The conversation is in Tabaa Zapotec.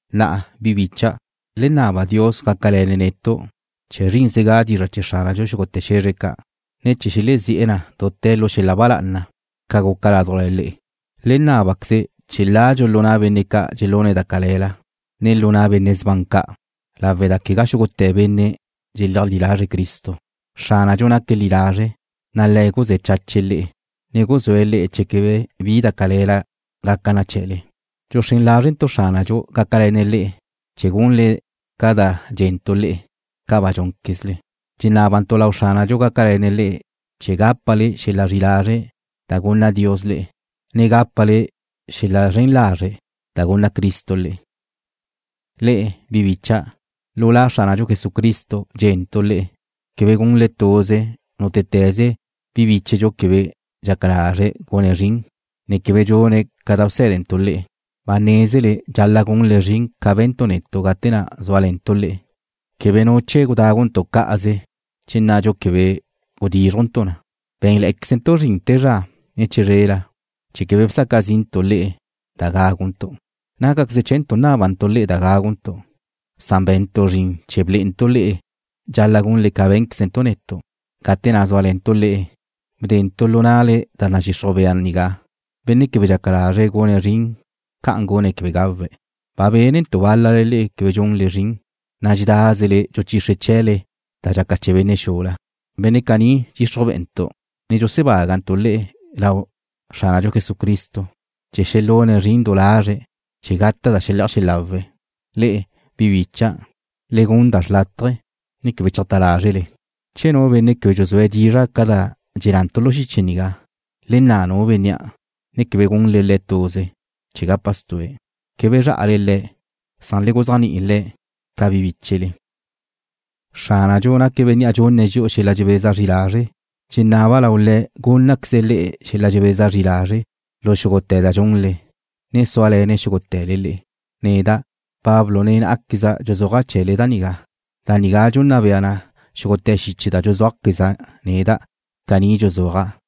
Na'a, bi bícha'dau', le naba Dios gácale̱ne̱' netu', chee̱ zrínzega dizra' chee̱ Xránadxu xúgute̱ xe̱zre ca', ne chee̱ xelezí'e̱ na dute̱ lu xel-la ba lá'ana, ca guca ládujla le'e. Le nábaquezle chee̱ ladxu lu na' benne' ca' dxelune̱' da cale̱la, ne lu na' benne' sban ca', lawe' da quegá xúgute̱ benne' dxeleajlí lazre̱' Cristo. Xránadxu naque̱' li lazre', na' Le̱' guzé̱ chache̱' le'e, ne guxúe̱' le'e chee̱ quebe bi da cale̱la gaca na chee̱le. Dxuxrén lázrentu' Xránadxu gácale̱ne̱' le'e chee̱ gunle ca da dxé̱nentu' le'e, ca ba dxúnquezle. Dxenábantu' lau Xránadxu gácale̱ne̱' le'e chee̱ gápale xel-la zri'i lazre' da gunna Dios le'e, ne gápale xel-la zren lazre' da gunna Cristo le'e. Le'e, bi bícha'dau', lu La Xránadxu Jesucristo dxé̱nentu' le'e quebe gunle tuze nútete̱ze bi bíchedxu quebe dxaca lazre̱' gune̱' zrin, ne quebe dxune̱' ca da bsé̱dentu' le'e. Ba nézele dxal-la' gunle zrin ca be̱ntu' netu' gate na' zúale̱ntu' le'e. Quebe nu chee̱ gudáguntu' cá'aze che nadxu quebe gudízrujntu' na. Bé̱nle̱'e̱quezentu' zrin te zra, ne chizrela chee̱ quebe bsaca zi'ntu' le'e da gáguntu'. Nácaqueze chee̱ntu' nábantu' le'e da gáguntu', san be̱ntu' zrin chee̱ blé'entu' le'e dxal-la' gunle ca bé̱nquezentu' netu'. Gate na' zúale̱ntu' le'e, bdentu' lu na'le da nadxixruj bea nigá: Benne' quebe dxaca lazre̱' gune̱' zrin ca'an gune̱' quebe gawe̱'. Ba bénentu' bál-lale le'e quebe dxunle zrin, na' dxedázele dxuchixre chee̱le da dxaca chee̱ benne' xula. Benne' caní dxixruj be'entu', ne dxusebágantu' le̱' lau Xránadxu Jesucristo chee̱ xelune̱' zrin du lazre̱' chee̱ gata' da xele'aj xelawe̱'. Le'e, bi bicha', le gun da xrlátaje, ne quebe cheajtá lázrele. Che nu benne' quebe dxuzúe̱' dizra' ca da dxennantu' lu xiche nigá, le nna' nu bénnea', ne quebe gunle le̱' tuze, chee̱ gapa stue̱'. Quebe zrá'ale le̱', san le guzéajni'i le̱' ca bi bíchele. Xránadxu naque̱' Bénnea' dxunne̱' dxi'u xel-la dxebeza zri lazre'. Dxenaba' lau Le̱' gúnnaqueze̱' le'e xel-la dxebeza zri lazre' lu xúgute̱ da dxunle, ne súale̱ne̱' xúgute̱le le'e. Neda', Pablo nen ná'aqueza' dxuzúaja' chee̱le da nigá. Da nigá dxunna bea na xúgute̱ xiche da dxuzúajqueza' neda'. Caní dxuzúaja'.